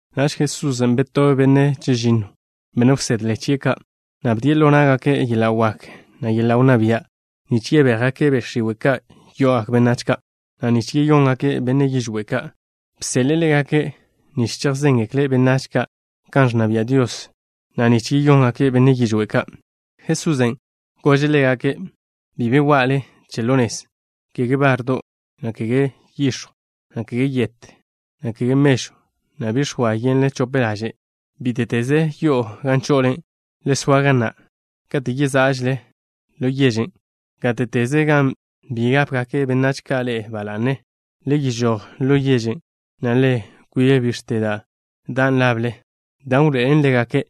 Naž Jesusen' betobe' benne' chežinno, benne' wsedle chie' ka', na' bdie' ḻo ná'gake' yeḻa' wak, na' yeḻa' wnná bia', nich yebéjgake' be' x̱iwe' ka' yo'ogak benách ka', na' nich yeyóngake' benne' yižwé' ka'. Bseḻe'e ḻégake' nich chejzéngekle' benách ka' kan ẕnna bia' Dios, na' nich yeyóngake' benne' yižwé' ka'. Jesusen' gože' ḻégake': —Bi be wa'le che ḻo nez, kege bardo', na' kege yix̱jw, na' kege yet, na' kege mežw, na' bi x̱oa yenle chope laže'. Bíte'teze yo'o gan cho'ole, le soa ga na' kate' yezá'žele ḻo yežen'. Gáte'teze gan bi gápegak benách ka' ḻe'e ba la'ne, le yežój ḻo yežen', na' le kwib bix̱te da' dan' lable, dan' wḻoe'elen ḻégake'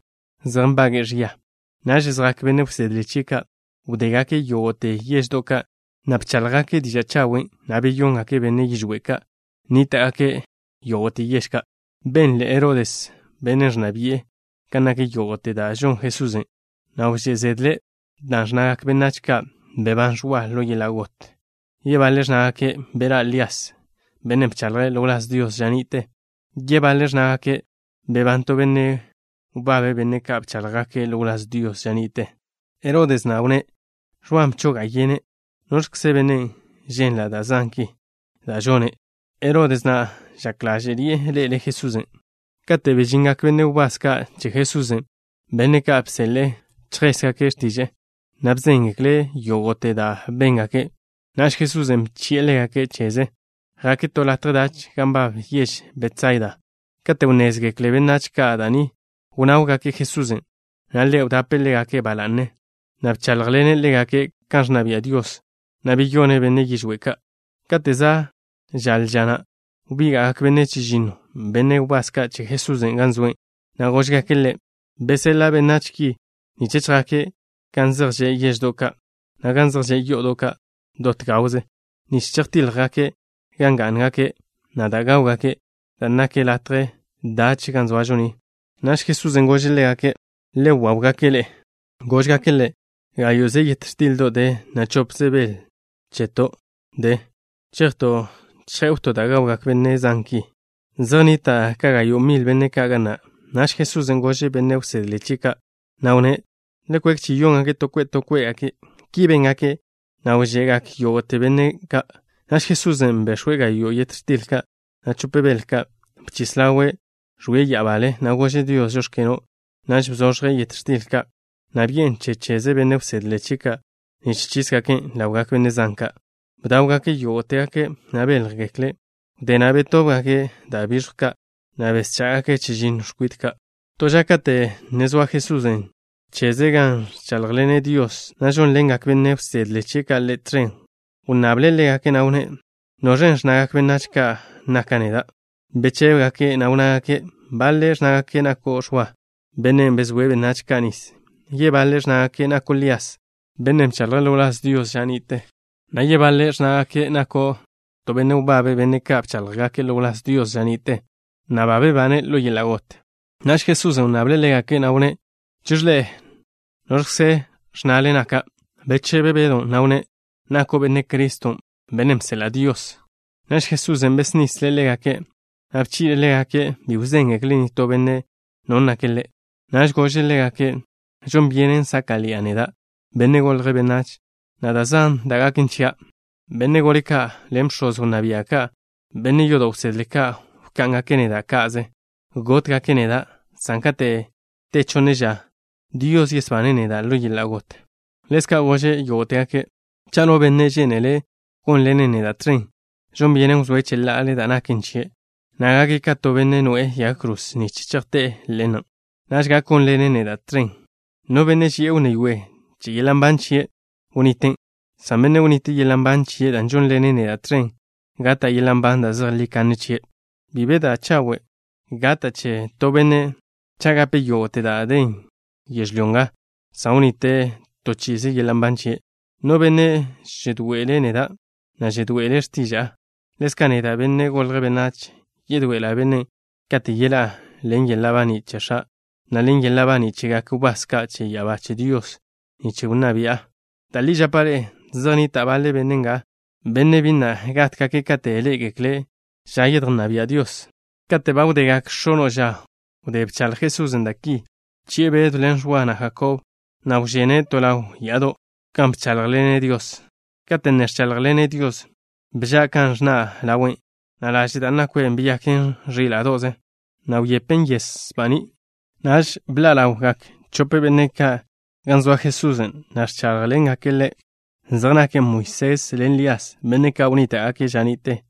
zej nbage'e ẕia. Naž zjak benne' wsedle chie' ka'. Wdégake' yógo'te yeždo' ka', na' bcháḻjgake' diža' chawen', na' beyóngake' benne' yižwé' ka' nníta'gake' yógo'te yež ka'. Benle Herodes, bennen' ẕnna bi'e, kan nak yógo'te da' žon Jesusen', na' wžé' zedle', dan' ẕnnagak benách ka': —Bebán Ẕwa ḻo yeḻa' got. Yebaḻe' ẕnnágake': —Beḻá' Lías, bennen' bchaḻje' ḻo wláz Dios ža ni'te. Yebaḻe' ẕnnágake': —Ba bebán to benne' wbabe' benne' ka' bcháḻjgake' ḻo wláz Dios ža ni'te. Herodes na' wnné': —Ẕwan' bchoga' yene'. ¿Noẕkze bennen', ženla' da' zan ki da' žone'? Herodes na' žak ḻáže'ḻi'e ḻe'ele' Jesusen'. Kate' bežingak benne' wbás ka' che Jesusen', benne' ka' bseḻe'e chejségake' x̱tiže'e, na' bzéngekle' Ḻe' yógo'te da' béngake'. Naž Jesusen' bchi'e ḻégake' cheze. Jake' to latje dach gan nbab yež Betsaida. Kate' wnnézgekle benách ka' da' ni, wnáwgake' Jesusen', na' Ḻe' wdape' ḻégake' ba la'ne, na' bcháḻjḻene' ḻégake' kan ẕnna bia' Dios, na' beyone' benne' yižwé' ka'. Kate' za' žaḻe ža na', wbíga'gak benne' chežinno, benne' wbás ka' che Jesusen', gan zoe', na' góžgake' Ḻe': —Beseḻa' benách ki nich chjake' gan zej že' yeždo' ka', na' gan zej že' yo'odo' ka' dot gawze, nich chejtíḻjgake' gan gá'ngake', na' da' gáwgake', dan' nak latje dach ga zoažo ni. Naž Jesusen' gože' ḻégake': —Le waw-gake' ḻe'e. Góžgake' Ḻe': —Gáyo'ze yet x̱tildo' de, na' chopze bel cheton' de. ¿Chejto' chjé'wto' da' gawgak benne' zan ki? Zej nnita' ka gayo' mil benne' ka' ga na'. Naž Jesusen' gože' benne' wsedle chie' ka', na' wnné': —Le kwek chi-yóngake' to kwe' to kwe'. Ki béngake', na' wže'gak yógo'te benne' ka'. Naž Jesusen' bex̱we' gayo' yet x̱til ka', na' chope bel ka'. Bchis ḻawe', ẕwie' ya'abale, na' gože' Dios: “Žóx̱keno'.” Naž bzoẕje' yet x̱til ka', na' bi'en che cheze benne' wsedle chie' ka' nich chísgaken' ḻawgak benne' zan ka'. Bdáwgake' yógo'tegake', na' béljgekle'. Wdé na' betóbgake' da' biẕjw ka', na' beschá'gake' chežinno x̱kwit ka'. To ža kate' ne zoa Jesusen' cheze gan ẕcháḻjḻene' Dios, na' žónḻengak benne' wsedle chie' ka' Ḻe' tẕen, wnnable' ḻégake', na' wnné': —¿Noẕen' ẕnnagak benách ka' naka' neda'? Bechébegake', na' wnnágake': —Baḻe' ẕnnágake' nako' Ẕwa, bennen' bezóe' benách ka' nis. Yebaḻe' ẕnnágake' nako' Lías, bennen' bchaḻje' ḻo wláz Dios ža ni'te, na' yebaḻe' ẕnnágake' nako' to benne' wbabe' benne' ka' bcháḻjgake' ḻo wláz Dios ža ni'te, na' ba bebane' ḻo yeḻa' got. Naž Jesusen' wnnable' ḻégake', na' wnné': —Cheẕe ḻe'e, ¿noẕkze ẕnnale naka'? Bechebe Bedw, na' wnné': —Nako' Benne' Criston', bennen' bseḻa' Dios. Naž Jesusen' besnisle' ḻégake', na' bchi'le' ḻégake' bi wzéngekle' nitó benne' No nake' Ḻe'. Naž gože' ḻégake': —Žon byenen sáka'ḻi'a neda', Benne' Golje' Benách, na' da' zan da' gaken chia'. Benne' gole ka' ḻen bx̱oz wnná bia' ka', na' benne' yodo' wsedle ka', wká'ngake' neda' ka'ze. Gótgake' neda', san kate' te chonne ža, Dios yesbane' neda' ḻo yeḻa' got. Ḻezka' gože' yógo'tegake': —Cha' no benne' žénele' gónḻena' neda' tẕen, žon byenen wzóe' cheḻa'ale da' naken chie', na' gake' ka to benne' noe'e yag kroze nich chejté'e ḻe'en. Naž gak gónḻene' neda' tẕen. No benne' ži'e wnné yoe che yeḻa' nban chie', wniten', san benne' wnite' yeḻa' nban chie' dan' žónḻene' neda' tẕen, gata' yeḻa' nban da' zejlí kanne chie'. Bi be da' chawe' gata' che to benne' cha' gape' yógo'te da' den yežlyó nga, san wnite' to chi'ize yeḻa' nban chie'. No benne' žedoe'ele' neda', na' žedoe'ele' x̱tiža'a, ḻezka' neda', Benne' Golje' Benách, yedoe'ela' bennen' kate' yeḻá'a ḻen yeḻa' baní' che X̱a', na' ḻen yeḻa' baní' chegak wbás ka' che ya'abá che Dios nich nna bi'a. Da' li žapa' ḻe'e, zej nnita' baḻe benne' nga, benne' bi na' gátgake' kate' ḻé'egekle' ža yedjnná bia' Dios. Kate' ba wdegak x̱ono' ža wdé bchaḻj Jesusen' da' ki, bchi'e Bedw ḻen Ẕwa, na' Jakob, na' wžene' to ḻaw ya'ado', gan bcháḻjḻene' Dios. Kate' ne ẕcháḻjḻene' Dios, bža' kan ẕnna' ḻawe', na' laže' da' nakwe' beyaken ẕíla'do'ze, na' wyepen yes baní'. Naž bḻa' ḻawgak chope benne' ka' gan zoa Jesusen', na' ẕcháḻjḻengake' Le'. Zej nake' Moisés ḻen Lías, benne' ka' wnníta'gake' ža ni'te.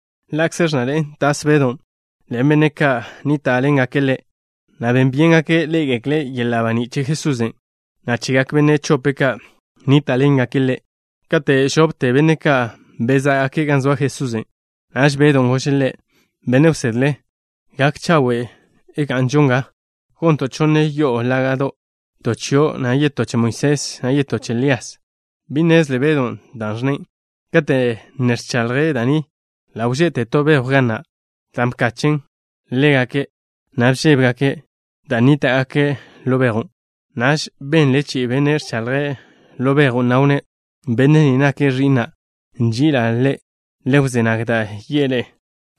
Ḻa'kze ẕnnaḻe'en tas Bedon', ḻen benne' ka' nníta'ḻengake' ḻe', na' ben byéngake' ḻé'egekle' yeḻa' baní' che Jesusen', na' chegak benne' chope' ka' nníta'ḻengake' Ḻe'. Kate' žopte benne' ka' bezá'gake' gan zoa Jesusen', naž Bedon' gože' Ḻe': —Benne' wsedle, gak chawe' ga'nžo nga. Gonto' chonne yo'o laga', to chio', na' yetó che Moisés, na' yetó che Lías. Bi nnezle Bedon' dan' ẕnne'. Kate' ne ẕchaḻje' da' ni, ḻa' wže'te to bejw ga na', dan' bkachen' ḻégake', na' bžébegake' dan' nníta'gake' ḻo bejwn'. Naž benle chi'i benne' ẕchaḻje' ḻo bejwn', na' wnné': —Benne' ni nake' Ẕi'na'. Nži'ila' Ḻe'. Le wzé nag da' yi'e ḻe'e.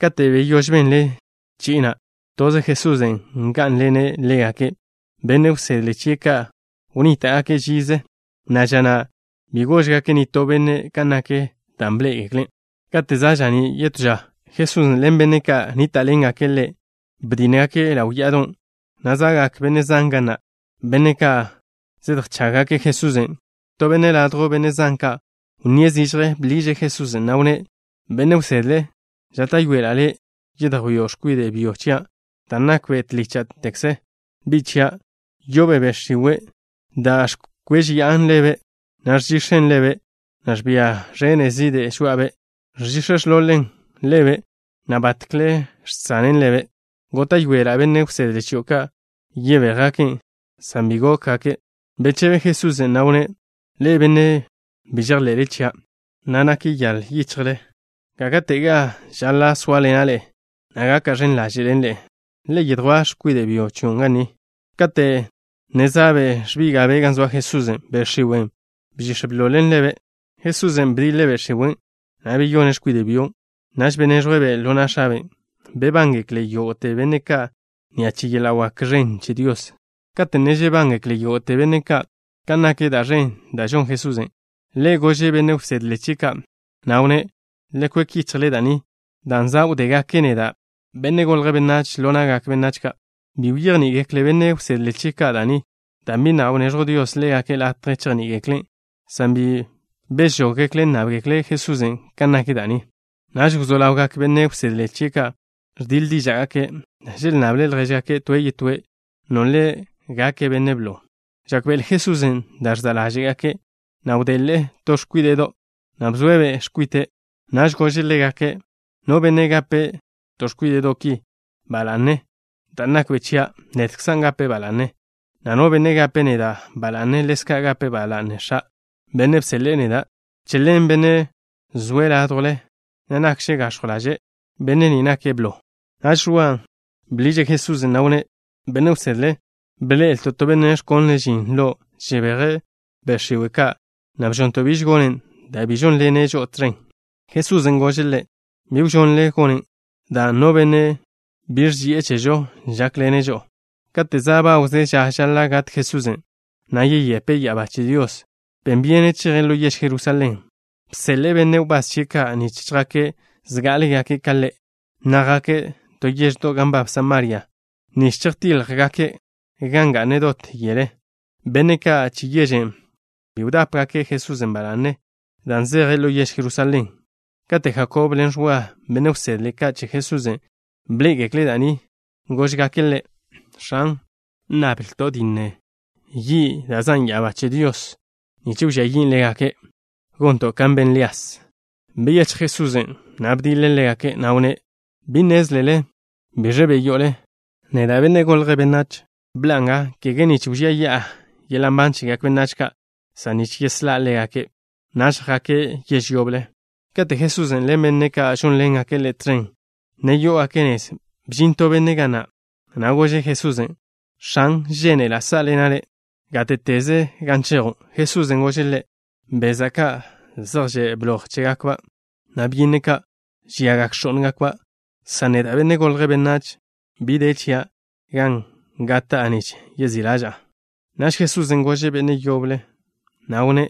Kate' beyóž benle chi'i na', toze Jesusen' ngá'nḻene' ḻégake'. Benne' wsedle chie' ka' wnníta'gake' žize, na' ža na' bi góžgake' nitó benne' kan nak da' bḻé'egekle'. Kate' za' ža'ní' yetó ža, Jesusen' ḻen benne' ka' nníta'ḻengake' Ḻe', bedínnegake' ḻaw ya'adon', na' za'gak benne' zan ga na', benne' ka' zedjchággake' Jesusen'. To benne' ladjw benne' zan ka' wnníe' zižje. Bḻiže' Jesusen', na' wnné': —Benne' wsedle, žáta'yoela' Le' yedjwío' x̱kwide' byo chia', dan' nakbe' tlícha'tekze bi' chia'. Yo'obe' be' x̱iwe' da' ẕkwéžeya'an ḻebe', na' žẕizḻe'en ḻebe', na' ẕbia ẕene' zide' žoa'abe'. Ẕchix̱ ẕḻol-ḻe'en ḻebe', na' batkle žsanen ḻebe'. Góta'yoela' benne' wsedle chio' ka' yebéjgaken', san bi gókgake'. Bechebe Jesusen', na' wnné': —Ḻe'e, benne' bi žejḻe'le chia', na' nyaḻ yichjle. ¿Gáka'tega žaḻa' sóaḻena' ḻe'e, na' gaka' ẕen ḻaže' ḻen ḻe'e? Le yedjwá' x̱kwide' byo chion' ga ni. Kate' ne za'be' ẕbíga'be' gan zoa Jesusen', be' x̱iwen' bchix̱ bḻol-ḻe'en ḻebe'. Jesusen' bdiḻe' be' x̱iwen', na' beyone' x̱kwide' byon'. Naž beneẕjwe'-be' ḻo na' x̱abe'. Bebángekle yógo'te benne' ka' ni'a che yeḻa' wak ẕen che Dios. Kate' ne žebángekle yógo'te benne' ka' kan nak da' ẕen da' žon Jesusen', Ḻe' gože' benne' wsedle chie' ka', na' wnné': —Le kwek yichjle da' ni, dan' za' wdégake' neda', Benne' Golje' Benách, ḻo na'gak benách ka'. Bi bejní'igekle benne' wsedle chie' ka' da' ni, dan' bi na' wneẕjw Dios ḻégake' latje chejní'igeklen', san bi bežóggekle' nnábgekle' Jesusen' kan nak da' ni. Naž wzó ḻawgak benne' wsedle ka' che Jesusen' ẕdiḻ díža'gake'. Želnnable ljéžgake' toe' yetóe' nole' gake' benne' blo. Žákbe'ele Jesusen' da' ẕza' ḻáže'gake', na' wdele' to x̱kwíde'do', na' bzoe'-be' kwite'. Naž gože' ḻégake': —No benne' gape' to x̱kwíde'do' ki ba la'ne dan' nakbe' chia', nedkzan' gape' ba la'ne, na' no benne' gape' neda' ba la'ne, ḻezka' gape' ba la'ne X̱a', Bennen' bseḻe'e neda'. Che ḻen, bennen' zoe' ládjwle, na' nakže' gax̱jw ḻaže', benne' ni nake' blo. Naž Ẕwa bḻiže' Jesusen', na' wnné': —Benne' wsedle, bḻe'elto' to benne' ẕkonle' žin lo' žebeje' be' x̱iwe' ka', na' bžonto' biž gonen' dan' bi žónḻene' žo'o tẕen. Jesusen' gože' ḻe': —Bi wžonle gonen', dan' no benne' bi ẕži'e chežo, žákḻene' žo'o. Kate' za' bawze ža žaḻa' gat Jesusen', na' yeyepe' ya'abá che Dios, ben byene' cheje' ḻo yež Jerusalén. Bseḻe'e benne' wbás chie' ka' nich chjake' zgá'alegake' ka Ḻe', na' jake' to yeždo' gan nbab Samaria, nich chejtíḻjgake' gan ga'ne' dot yele. Benne' ka' che yežen' bi wdápegake' Jesusen' ba la'ne dan' zeje' ḻo yež Jerusalén. Kate' Jakob ḻen Ẕwa, benne' wsedle ka' che Jesusen', bḻé'egekle' da' ni, góžgake' Ḻe': —X̱an, ¿nnablto' dinne yi' da' zan' ya'abá che Dios nich wžía yin' ḻégake', gonto' kan ben Lías? Byechj Jesusen', na' bdiḻe' ḻégake', na' wnné': —Bi nnézlele biẕ be' yo'ole. Neda', Benne' Golje' Benách, bḻa'a nga, kege nich wžía yi'a yeḻa' nban chegak benách ka', san nich yeslá' ḻégake'. Naž jake' yež yoble. Kate' Jesusen' ḻen benne' ka' žónḻengake' Ḻe' tẕen ne yó'ogake' nez, bžin to benne' ga na', na' gože' Jesusen': —X̱an, žénela' sá'ḻena' Le' gáte'teze gan chejo'. Jesusen' gože' ḻe': —Beza' ka', zej že' bloj chégakba', na' byínnedo' ka', žiagak x̱ó'ngakba' ka', san neda', Benne' Golje' Benách, bi de chia' gan gata'a nich yezí' ḻaža'a. Naž Jesusen' gože' benne' yoble, na' wnné':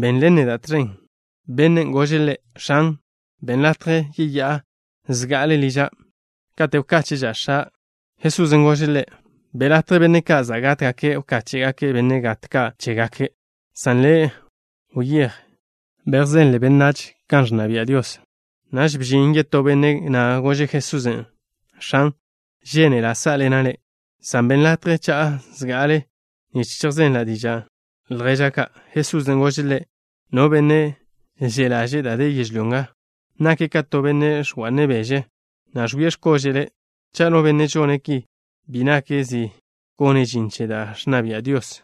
—Benḻen neda' tẕen. Bennen' gože' Ḻe': —X̱an, benn latje yeyá'a zga'ale liža', kate' wkáche'ža' x̱a'. Jesusen' gože' ḻe': —Be' latje benne' ka' za' gátgake' wkáche'gake' benne' gat ka' chégake', san le', wyéj, bejzenle benách kan ẕnna bia' Dios. Naž bžin yetó benne', na' gože' Jesusen': —X̱an, žénela' sá'ḻena' Le', san benn latje cha'a zga'ale nich chejzela' diža' lježa' ka'. Jesusen' gože' ḻe': —No benne' že' ḻaže'e da' de yežlyó nga, nake' ka to benne' ẕga'ne' beže, na' ẕwie' x̱kóže'le'. Cha' no benne' žone' ki, bi nake' zi gone' žin che da' ẕnna bia' Dios.